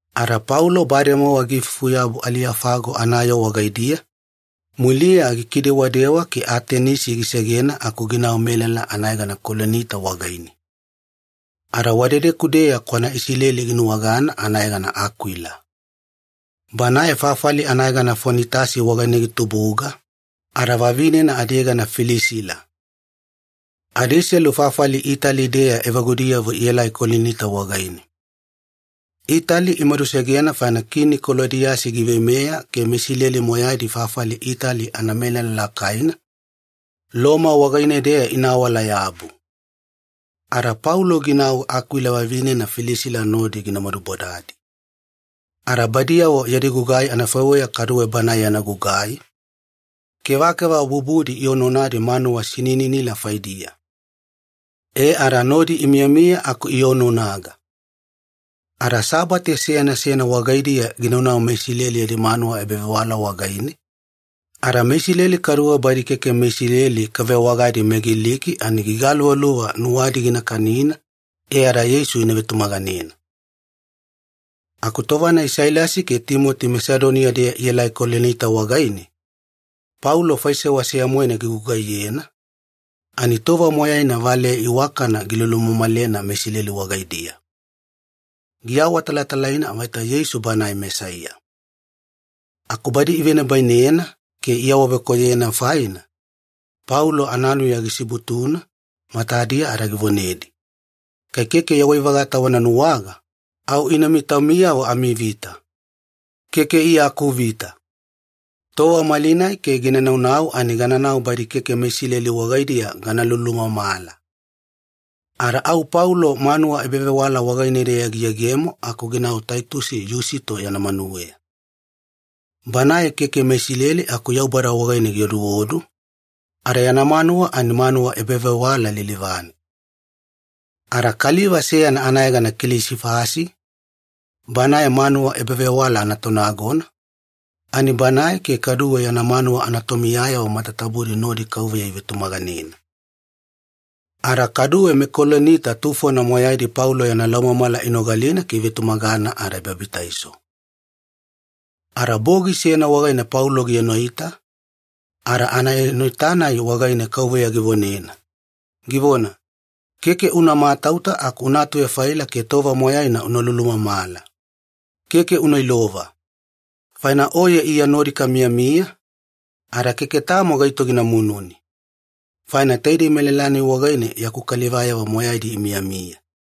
Ada Paulo bademowa giifufuyabu Aliyofago anayoo wagaidiya, muliya gikidewadewa ke Atenisi gisegena aku ginau melala anayegana Kolinita wagaine. Ada wadedeku-deya kwana Isileli ginuwagana anayegana Akwila. Banae fafali anayegana Fonitasi wagaine gitubuga, ada vavinena adiyegana Pilisila. Adiselu fafali Itali-deya evagudiyavo ielai Kolinita wagaine. Itali imadusegena faina Kini Kolodiyasi giveimeya ke meIsileli moyaidi fafali Itali anamelala lakaina Loma wagaine-deya ina awala-yabu. Ada Paulo ginau Akwila vavinena Pilisila nodi gina madubodadi. Ada badiyavo yadi gugai anafaiweya kaduwe banae yana gugai, kevakeva bubudi ionaonadi manuwa sinininila faidiya. E ada nodi imiyamiya aku ionaonaga. Ada Sabate seyana seyana wagaidiya ginaunau meIsileli yadi manuwa ebavewala wagaine, ada meIsileli kaduwe badi keke meIsileli kavewagadi meGiliki ani gigaluvaluva nuwadi gina kanina e ada Yeisu ina vetumaganena. Aku tova-nai Sailasi ke Timoti Masedoniya-deya ielai Kolinita wagaine, Paulo faisewa seya-moena gigugaiyena, ani tova moyaina valeya iwakana gilulumamalena meIsileli wagaidiya. Giawatalatalaina vaita Yeisu Banae Mesaiya. Aku badi ivenibainena ke iawavekoyoyena faina, Paulo ananuya gisibutuna matadiya ada givonedi, “Kai keke yawai-vagata wana nuwaga, au ina taumiyavo amivita. Keke Iya akuvita. Tova malinai ke gina naunau ani gananau badi keke meIsileli wagaidiya gana lulumamala.” Ada au Paulo manuwa ebavewala wagaine-deya giyegemo aku ginau Taito Yusito yana manuweya. Banae keke meIsileli aku Yaubada wagaine gioduodu, ada yana manuwa ani manuwa ebavewala lilivane. Ada kaliva seyana anayegana Kilisifasi, banae manuwa ebavewala anatonagona, ani banae ke kaduwe yana manuwa anatomiyayavo matatabudi nodi Kauveya ivetumaganena. Ada kaduwe meKolinita tufona moyaidi Paulo yana laumamala inogalina ke ivetumagana ada ibabitaiso. Ada bogi seyana wagaine Paulo gienoita, ada anaenoita-nai wagaine Kauveya givonena, givona, “Keke una matauta aku una atuvefaila ke tova moyaina una lulumamala. Keke una ilova. Faina oye Iya nodi kamiyamiya, ada keke tamo gaito gina mununi. Faina taidei melala-nai wagaine yaku kalivayavo moyaidi imiyamiya.”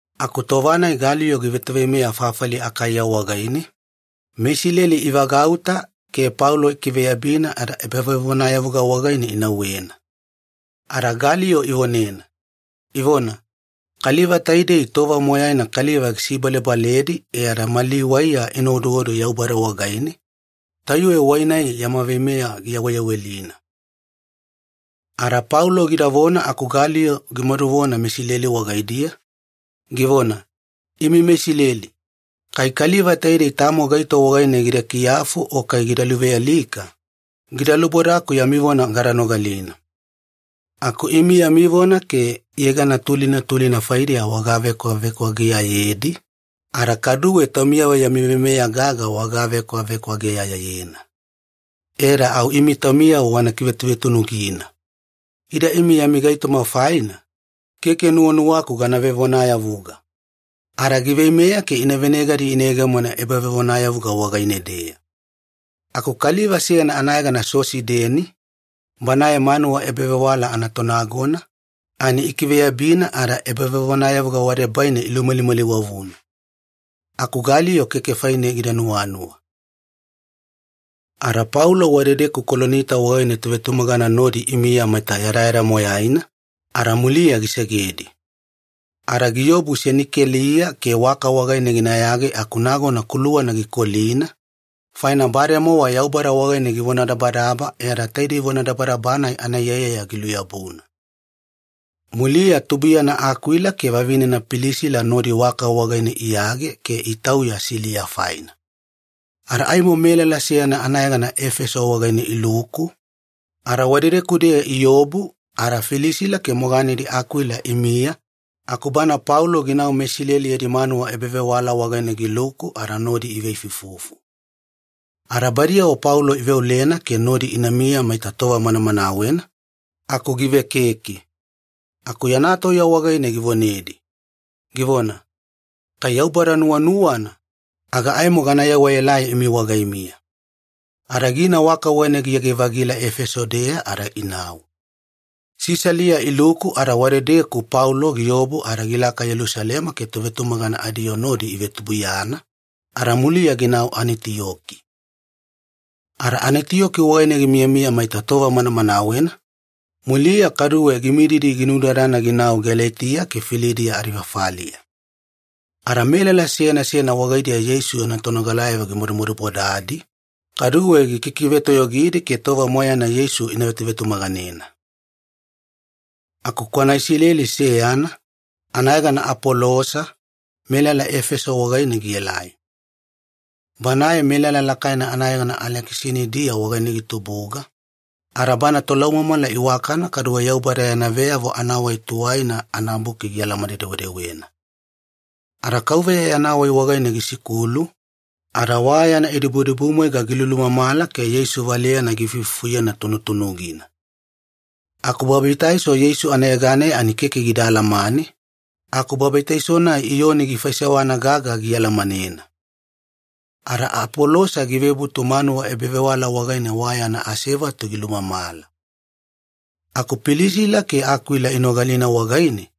Aku tova-nai Galiyo givetoveimeya fafali Akaiya wagaine, meIsileli ivagauta ke Paulo ikiveyabina ada ebavevonayavuga wagaine inauwena. Ada Galiyo ivonena, ivona, “Kaliva taidei tova moyaina kaliva gisibalebaledi e ada mali waiya ina oduodu Yaubada wagaine, tayuwe wai-nai yama veimeya giyaweyawelina.” Ada Paulo gidavona aku Galiyo gimaduvona meIsileli wagaidiya, givona, “Imi meIsileli, kai kaliva taidei tamo gaito wagaine gida kiyafu o kai gida luvealika, gida lubodaku yami vona gada nogalina. Aku imi yami vona ke yegana tulina tulina faidiya wagavekwavekwageyayedi, ada kaduwe taumiyavo yami veimeya gaga wagavekwavekwageyayena. E ada au imi taumiyavo wana kivetuvetunugina. Ida imi yami gaitoma faina, keke nuwanuwaku gana vevonayavuga.” Ada giveimeya ke ivenegadi iyegemona ebavevonayavuga wagaine-deya. Aku kaliva seyana anayegana Sosideni, banae manuwa ebavewala anatonagona, ani ikiveyabina ada ebavevonayavuga wadebaine ilumalimaliwavuna. Aku Galiyo keke faine gida nuwanuwa. Ada Paulo wadedeku Kolinita wagaine tovetumagana nodi imiya maita yadayada moyaina, ada muliya gisegedi. Ada giobu Senikeliya ke waka wagaine ginayage aku nagona kuluwana gikolina, faina bademowa Yaubada wagaine givonadabadaba e ada taidei vonadabadaba-nai anaiyaiyaya giluyabuna. Muliya tubuiyana Akwila ke vavinena Pilisila nodi waka wagaine iyage ke itauya Siliya faina. Ada aimo melala seyana anayegana Efeso wagaine iluku, ada wadedeku-deya iobu ada Pilisila ke moganedi Akwila imiya aku bana Paulo ginau meIsileli yadi manuwa ebavewala wagaine giluku ada nodi iveifuifufu. Ada badiyavo Paulo iveolena ke nodi inamiya maita tova manamanawena, aku givekeke. Aku yana tauya wagaine givonedi, givona, “Kai Yaubada nuwanuwana, aga aimo gana yewaelai imi wagaimiya.” Ada gina waka wagaine giyage-vagila Efeso-deya ada inau. Sisalia iluku ada wadedeku Paulo giobu ada gilaka Yelusalema ke tovetumagana adiyoo nodi ivetubuiyana, ada muliya ginau Anitiyoki. Ada Anitiyoki wagaine gimiyamiya maita tova manamanawena, muliya kaduwe gimididi ginudadana ginau Galetiya ke Filidiya adifafaliya. Ada melala seyana seyana wagaidiya Yeisu yana tonogalayavo gimadumadubodadi, kaduwe gikikivetoyogidi ke tova moyaina Yeisu ina vetuvetumaganena. Aku kwana Isileli seyana, anayegana Apolosa, melala Efeso wagaine gielai. Banae melala lakaina anayegana Alekisanidia wagaine gitubuga, ada bana tolaumamala iwakana kaduwe Yaubada yana Veyavo Anawai Tuwaina anaBuki gialamane-dewedewena. Ada Kauveya yana wai wagaine gisikulu, ada wa yana idibudibumwaiga gilulumamala ke Yeisu valeyana giifuifufuyena tunutunugina. Aku babitaiso Yeisu anayeganeya ani keke gida alamane, aku babitaiso-nai Iyoni gifaisewana gaga gialamanena. Ada Apolosa givebutu manuwa ebavewala wagaine wa yana asevatu gilumamala. Aku Pilisila ke Akwila inogalina wagaine,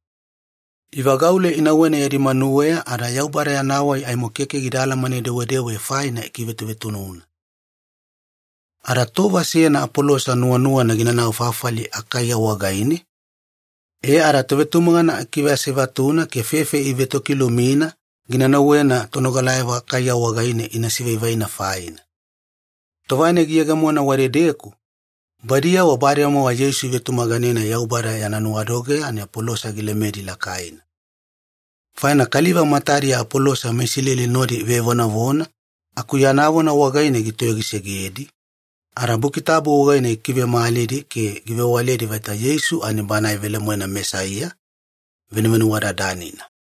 ivagaule inauwena yadi manuweya ada Yaubada yana wai aimo keke gida alamane-dewedewe faina ikivetuvetununa. Ada tova seyana Apolosa nuwanuwana ginanau fafali Akaiya wagaine, e ada tovetumagana ikiveasevatuna ke fefe ivetokilumina gina nauwena tonogalayavo Akaiya wagaine ina sivaivaina faina. Tova-nai giyegemona wadedeku, badiyavo bademowa Yeisu ivetumaganena Yaubada yana nuwadogeya ani Apolosa gilemedi lakaina. Faina kaliva matadiya Apolosa meIsileli nodi ivevonavona aku yana vona wagaine gitoyogisegedi, ada Buki Tabu wagaine gikivemalidi ke givewaledi vaita Yeisu ani Banae velemoena Mesaiya, Venuvenuwadadanina.